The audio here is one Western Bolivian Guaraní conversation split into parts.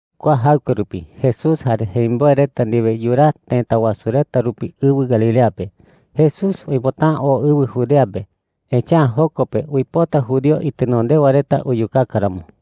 Kua jaɨkue rupi Jesús jare jemimboe reta ndiwe yuraa tëta wasu reta rupi ɨwɨ Galilea pe. Jesús uipota’ä oo ɨwɨ Judea pe, echa’ä joko pe uipota judío itenondewa reta uyukaka ramo.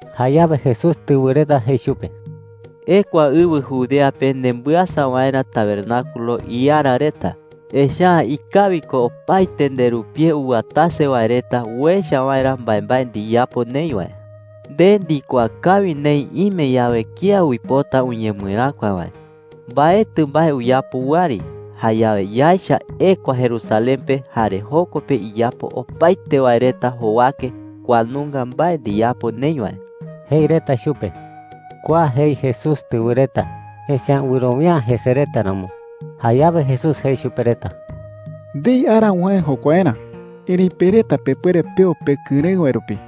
Jayawe Jesús tɨwɨ reta jei chupe: “Ekua ɨwɨ Judea pe nembɨasa waerä tabernáculos iara reta. Echa’ä ikawi ko opaete nderupie uwatase wae reta uecha waerä mbaembae ndiyapo neï wae. Nde ndikuaa kawi neï ime yawe kía uipota uñemɨeräkua wae, mbaetɨ mbae uyapo wɨari. Jayawe yaecha ekua Jerusalén pe, jare joko pe iyapo opaete wae reta jowake kua nunga mbae ndiyapo neï wae,” jei reta chupe. Kua jei Jesús tɨwɨ reta, echa’ä wɨrowia’ä jese reta ramo. Jayawe Jesús jei chupe reta: “Ndei ara uwäe jokuaerä. Erëi pe reta pepuere peo pekɨrëɨ wae rupi,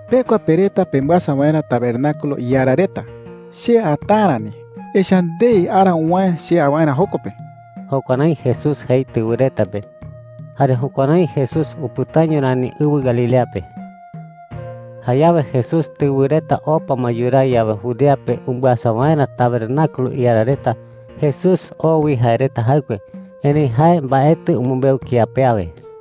“Pekua, pe reta, pembɨasa waerä tabernáculos iara reta. Che ata’ä rani, echa’ä ndei ara uwäe che a waerä joko pe.” Jukuärái Jesús jei tɨwɨ reta pe. Jare jukuärái Jesús upɨtaño rani ɨwɨ Galilea pe. Jayawe Jesús tɨwɨ reta opa ma yuraa yawe Judea pe umbɨasa waerä tabernáculos iara reta, Jesús oo wi jae reta jaɨkue. Erëi jae mbaetɨ umɨmbeu kía pe awe.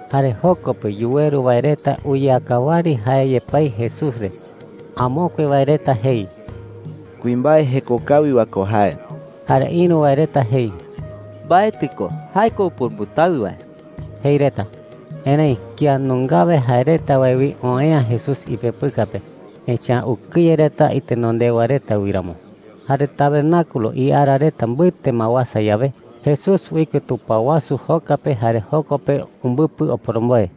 Jare joko pe yuweru wae reta uyeaka wɨari jae yepái Jesús re. Amokue wae reta jei: “Kuimbae jeko kawi wae ko jae.” Jare ïru wae reta jei: “Mbaetɨ ko. Jae ko upurumbɨtawɨ wae,” jei reta. Erëi kía nungawe jae reta wae wi oë'ä Jesús ipepɨka pe, echa’ä ukɨye reta itenondewa reta wi ramo. Jare tabernáculos iara reta mbɨte ma uasa yawe, Jesús uike tupao wasu joka pe jare joko pe umbɨpɨ oporomboe.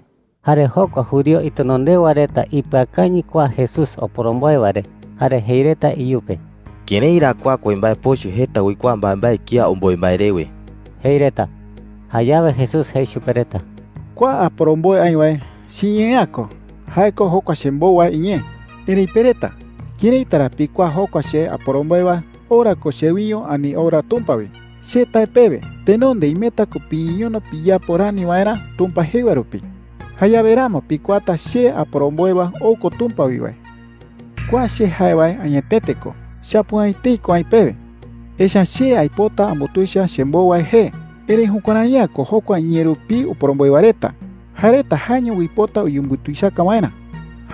Jare jokua judío itenondewa reta ipɨakañɨ kua Jesús oporomboe wae re jare jei reta iyupe: “¿Kërái ra kua kuimbae pochɨ jeta uikuaa mbaembae kía omboe mbae rewe?” jei reta. Jayawe Jesús jei chupe reta: “Kua aporomboe aï wae, chiñee’ä ko. Jae ko jokua chembou wae iñee,” jei. “Erëi pe reta, ¿këraita ra pikuaa jokua che aporomboe wae ou ra ko chewiño ani ou ra Tumpa wi? Che tae pewe, tenonde imeta ko piñeñono piyapo rani waerä Tumpa jei wae rupi. Jayawe ramo pikuaata che aporomboe wae ou ko Tumpa wi wae,” jei. “Kua che jae wae añetete ko. Chapu’ä etei ko aï pewe, echa’ä che aipota ambutuicha chembou wae jee. Erëi jukuärai’ä ko jokua iñee rupii oporomboe wae reta. Jae reta jaeño uipota uyembutuichaka waerä,” jei chupe reta.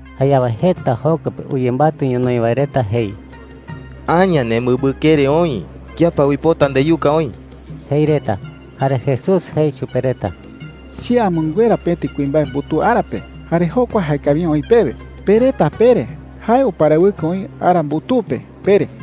Jayawe jeta joko pe uyembatɨ ñonoï wae reta jei: “¡Aña nemɨmbɨkere oï! ¿Kía pa uipota ndeyuka oï?” jei reta. Jare Jesús jei chupe reta: “Che amɨnguera pëti kuimbae mbutuu ara pe, jare jokua jaekawi’ä oï pewe. Pe reta pere: ‘Jae uparawɨkɨ oï ara mbutuu pe,’ pere.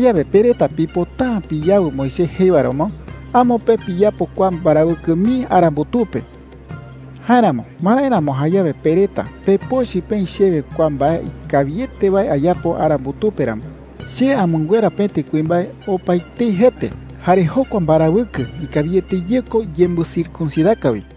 “Jayawe pe reta pipota’ä piyawɨ Moisés jei wae ramo, amo pe piyapo kua mbarawɨkɨ mii ara mbutuu pe. Jáeramo, ¿marái ramo jayawe pe reta pepochɨ peï chewe kua mbae ikawiete wae ayapo ara mbutuu pe ramo? Che amɨnguera pëti kuimbae opaetei jete, jare jokua mbarawɨkɨ ikawiete ye ko yembɨcircuncidaka wi,” jei.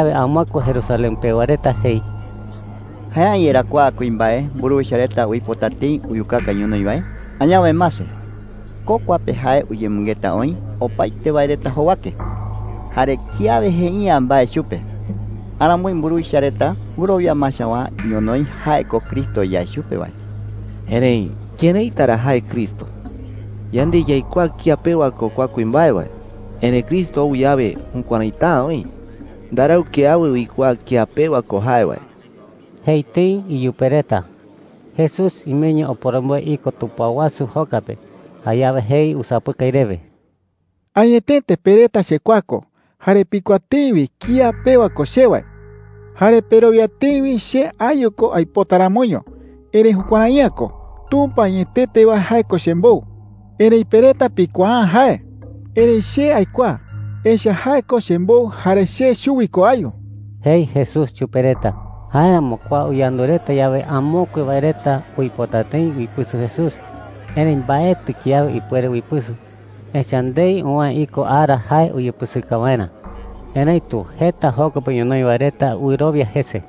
Jayawe amokue Jerusalén pewa reta jei: “¿Jae’ä yerá kua kuimbae mburuwicha reta uipota tëi uyukaka ñonoï wae? Añawe mase, ko kua pe jae uyemɨngeta oï opaete wae reta jowake. Jare kiawe jei’ä mbae chupe. Aramoi mburuwicha reta wɨrowia ma chawaa ñonoï jae ko Cristo yae chupe wae. Erëi ¿këraita ra jae Cristo? Yande yaikuaa kía pewa ko kua kuimbae wae. Erëi Cristo ou yawe, jukuäraita’ä oï. Ndarau kiawe uikuaa kía pewa ko jae wae,” jei tëi iyupe reta. Jesús imeño oporomboe iko tupao wasu joka pe. Jayawe jei usapɨkai rewe: “Añetete pe reta chekuaa ko, jare pikuaa tëi wi kía pewa ko che wae. Jare perowia tëi wi che ayu ko aipota ramoño. Erëi jukuärai’ä ko. Tumpa añetete wae, jae ko chembou. Erëi pe reta pikuaa’ä jae. Erëi che aikuaa, echa’ä jae ko chembou jare che chuwi ko ayu,” jei Jesús chupe reta. Jáeramo kua uyandu reta yawe, amokue wae reta uipota tëi uipɨsɨ Jesús. Erëi mbaetɨ kiawe ipuere uipɨsɨ, echa’ä ndei uwäe iko ara jae uyepɨsɨka waerä. Erëitu jeta joko pe ñonoï wae reta wɨrowia jese.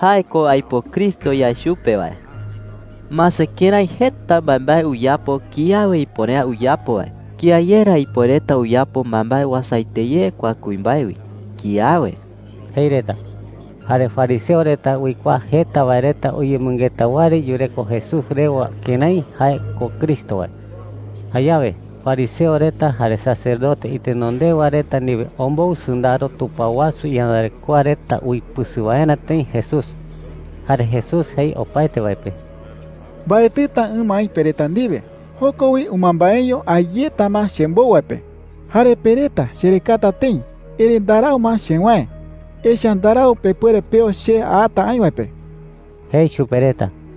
“Jae ko aipo Cristo yae chupe wae,” jei reta. “Mase kërái jeta mbaembae uyapo kiawe ipuere’ä uyapo wae. ¿Kía ye ra ipuereta uyapo mbaembae uasaete ye kua kuimbae wi? Kiawe,” jei reta. Jare fariseo reta uikuaa jeta wae reta uyemɨngeta wɨari yureko Jesús rewa kërái jae ko Cristo wae. Jayawe fariseo reta jare sacerdote itenondewa reta ndiwe ombou sɨndaro tupao wasu iyandarekoa reta uipɨsɨ waerä tëi Jesús. Jare Jesús jei opaete wae pe: “Mbaetɨta ɨma aï pe reta ndiwe. Joko wi ɨmambaeño a yeta ma chembou wae pe. Jare pe reta cherekata tëi, erëi ndarau ma chewäe, echa’ä ndarau pepuere peo che ata aï wae pe,” jei chupe reta.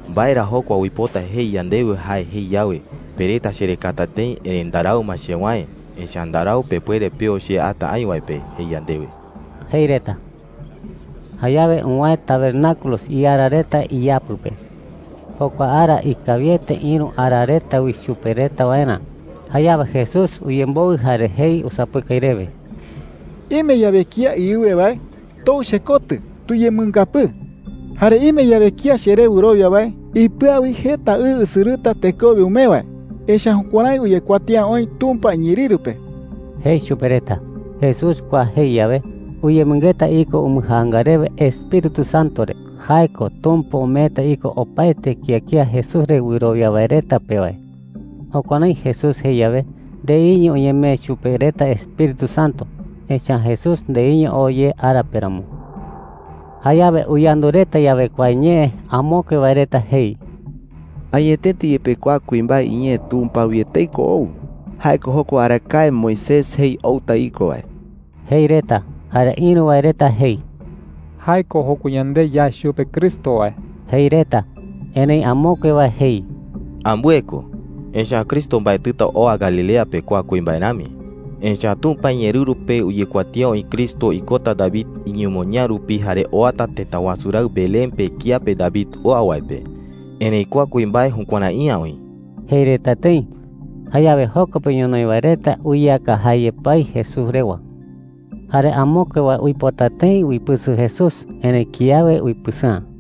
¿Mbae ra jokua uipota jei yandewe jae jei yawe, ‘Pe reta cherekata tëi, erëi ndarau ma chewäe, echa’ä ndarau pepuere peo che ata aï wae pe,’ jei yandewe?” jei reta. Jayawe uwäe tabernáculos iara reta iyapɨ pe. Jokua ara ikawiete ïru ara reta wi chupe reta waerä. Jayawe Jesús uyemboɨ jare jei usapɨkai rewe: “Ime yawe kía iɨwe wae, tou chekotɨ tuyemɨngapɨɨ,” jei. “Jare ime yawe kía cheré wɨrowia wae, ipɨa wi jeta ɨ usɨrɨta tekowe umee wae. Echa’ä jukuärái uyekuatía oï Tumpa iñeerɨru pe,” jei chupe reta. Jesús kua jei yawe, uyemɨngeta iko umbɨjaanga rewe Espíritu Santo re – jae ko Tumpa umeeta iko opaete kía kía Jesús re wɨrowia wae reta pe wae. Jukuärái Jesús jei yawe, ndeiño uñemee chupe reta Espíritu Santo, echa’ä Jesús ndeiño oo ye ara pe ramo. Jayawe uyandu reta yawe kua ñee, amokue wae reta jei: “Añetete yepe kua kuimbae iñee Tumpa wi etei ko ou. Jae ko jokua arakae Moisés jei outa iko wae,” jei reta. Jare ïru wae reta jei: “Jae ko jokua yande yae chupe Cristo wae,” jei reta. Erëi amokue wae jei: “Ambɨe ko. Echa’ä Cristo mbaetɨta oa Galilea pe kua kuimbae rami. Echa’ä Tumpa iñeerɨru pe uyekuatía oï Cristo ikota David iñemoñaa rupi jare oata tëta wasu raɨ Belén pe kiape David oa wae pe. Erëi kua kuimbae jukuärai’ä oï,” jei reta tëi. Jayawe joko pe ñonoï wae reta uyeaka jae yepái Jesús rewa. Jare amokue wae uipota tëi uipɨsɨ Jesús, erëi kiawe uipɨsɨ'ä.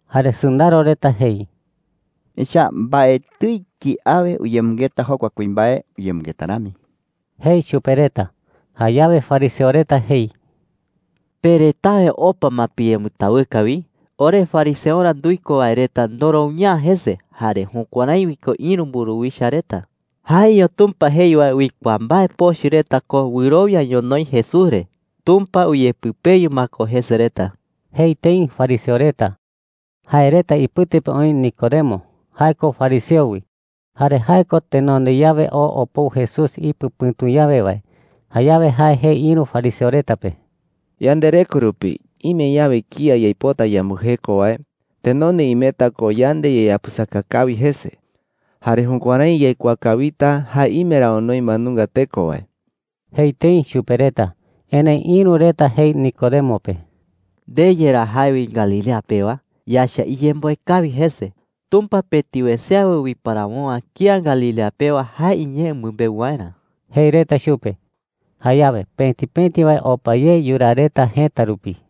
Jare sɨndaro reta jei: “Echa’ä mbaetɨi kiawe uyemɨngeta jokua kuimbae uyemɨngeta rami,” jei chupe reta. Jayawe fariseo reta jei: “¿Pe retawe opa ma piyembɨtawɨka wi? Ore fariseorä nduiko wae reta ndorowia’ä jese, jare jukuärái wi ko ïru mburuwicha reta. Jaeño Tumpa jei wae uikuaa mbae pochɨ reta ko wɨrowia ñonoï Jesús re. Tumpa uyepɨpeyu ma ko jese reta,” jei tëi fariseo reta. Jae reta ipɨte pe oï Nicodemo. Jae ko fariseo wi. Jare jae ko tenonde yawe oo opou Jesús ipɨ pɨ̈tu yawe wae. Jayawe jae jei ïru fariseo reta pe: “Yandereko rupi ime yawe kía yaipota yambɨjeko wae, tenonde imeta ko yande yayapɨsaka kawi jese. Jare jukuärái yaikuaa kawita jae ime ra onoi mbae nunga teko wae,” jei tëi chupe reta. Erëi ïru reta jei Nicodemo pe: “¿Nde yerá jae wi Galilea pewa? Yaecha iyemboe kawi jese. Tumpa pëti wese awe uiparawo’ä kía Galilea pewa jae iñee umɨmbeu waerä,” jei reta chupe. Jayawe pëti pëti wae opa ye yuraa reta jëta rupi.